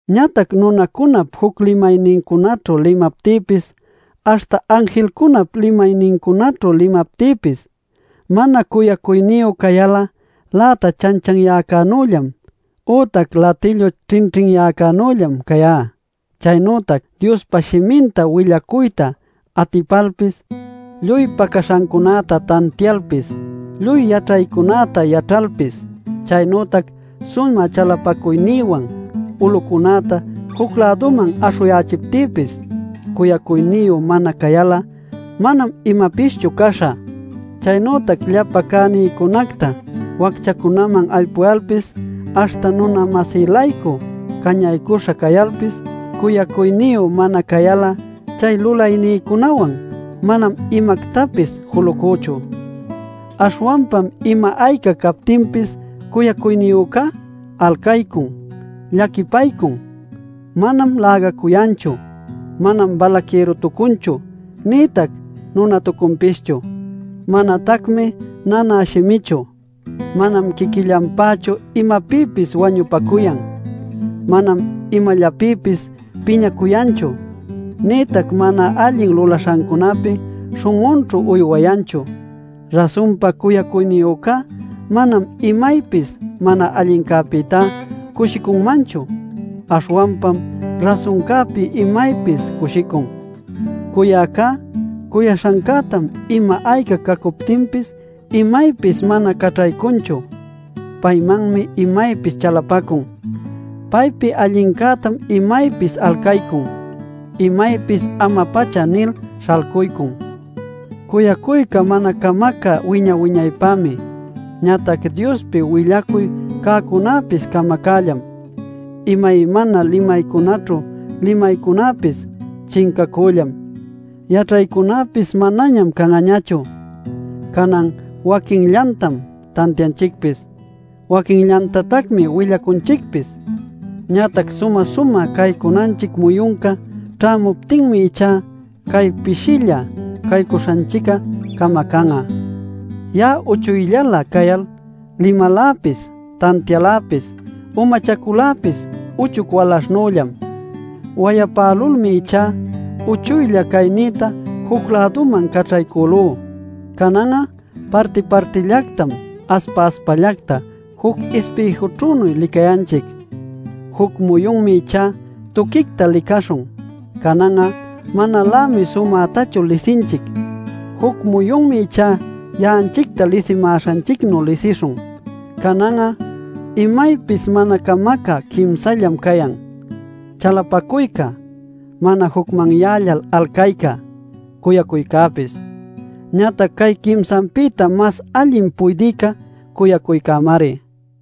Ñatac nunacunap juc limaynincunaćhu limaptïpis, aśhta anjilcunap limaynincunaćhu limaptïpis, mana cuyacuyniyu cayal'a läta chanchanyäcänüllam ütac latillu ćhinćhinyäcänüllam cayá. Chaynütac Diospa shiminta willacuyta atipalpis, lluy pacaśhancunäta tantialpis, lluy yaćhaycunäta yaćhalpis, chaynütac sumä chalapacuynïwan ulucunäta juc-läduman aśhuyächiptïpis, cuyacuyniyu mana cayal'a, manam imapischu caśhä. Chaynütac llapa cänïcunacta wacchacunäman aypuyalpis, aśhta nuna-masï-laycu cañaycuśha cayalpis, cuyacuyniyu mana cayal'a chay lulaynïcunawan manam imactapis julucüchu. Aśhwanpam ima ayca captinpis cuyacuyniyücá: alcaycun, llaquipaycun, manam lägacuyanchu. Manam balaquïrutucunchu nïtac nunatucunpischu. Manatacmi nanä shimichu, manam quiquillanpächu imapïpis wañupacuyan, manam imallapïpis piñacuyanchu, nïtac mana allin lulaśhancunapi śhun'unćhu uywayanchu. Rasunpa cuyacuyniyücá manam imaypis mana allincäpïta cushicunmanchu, aśhwanpam rasuncäpi imaypis cushicun. Cuyäcá cuyaśhancätam ima ayca cacuptinpis imaypis mana caćhaycunchu; paymanmi imaypis chalapacun; paypi allincätam imaypis alcaycun; imaypis ama-pacha nil śhalcuycun. Cuyacuyca mana camacä wiña-wiñaypämi. Ñatac Diospi willacuy cäcunäpis camacällam; imaymana limaycunaćhu limaycunäpis chincacüllam; yaćhaycunäpis manañam can'añachu. Canan waquinllantam tantianchicpis, waquinllantatacmi willacunchicpis. Ñatac sumä-sumä caycunanchic muyunca ćhämuptinmi ichá cay pishïlla caycuśhanchic'a camacan'a. Ya'a uchuyllalä cayal limaläpis, tantialäpis, umachaculäpis uchuy walaśhchanüllam. Wayapälulmi ichá uchuylla caynïta juc-läduman caćhaycülú. Canan'a parti-partillactam aspa-aspallacta juc ispïjućhünuy licayanchic. Juc muyunmi ichá tuquicta licaśhun. Canan'a manalämi sumätachu lisinchic. Juc muyunmi ichá ya'anchicta lisimäśhanchicnuy lisishun. Canan'a imaypis mana camacä quimsallam cayan: chalapacuyca, mana jucmanyällal alcayca, cuyacuycäpis. Ñatac cay quimsanpïta mas allin puydïcá cuyacuycämari.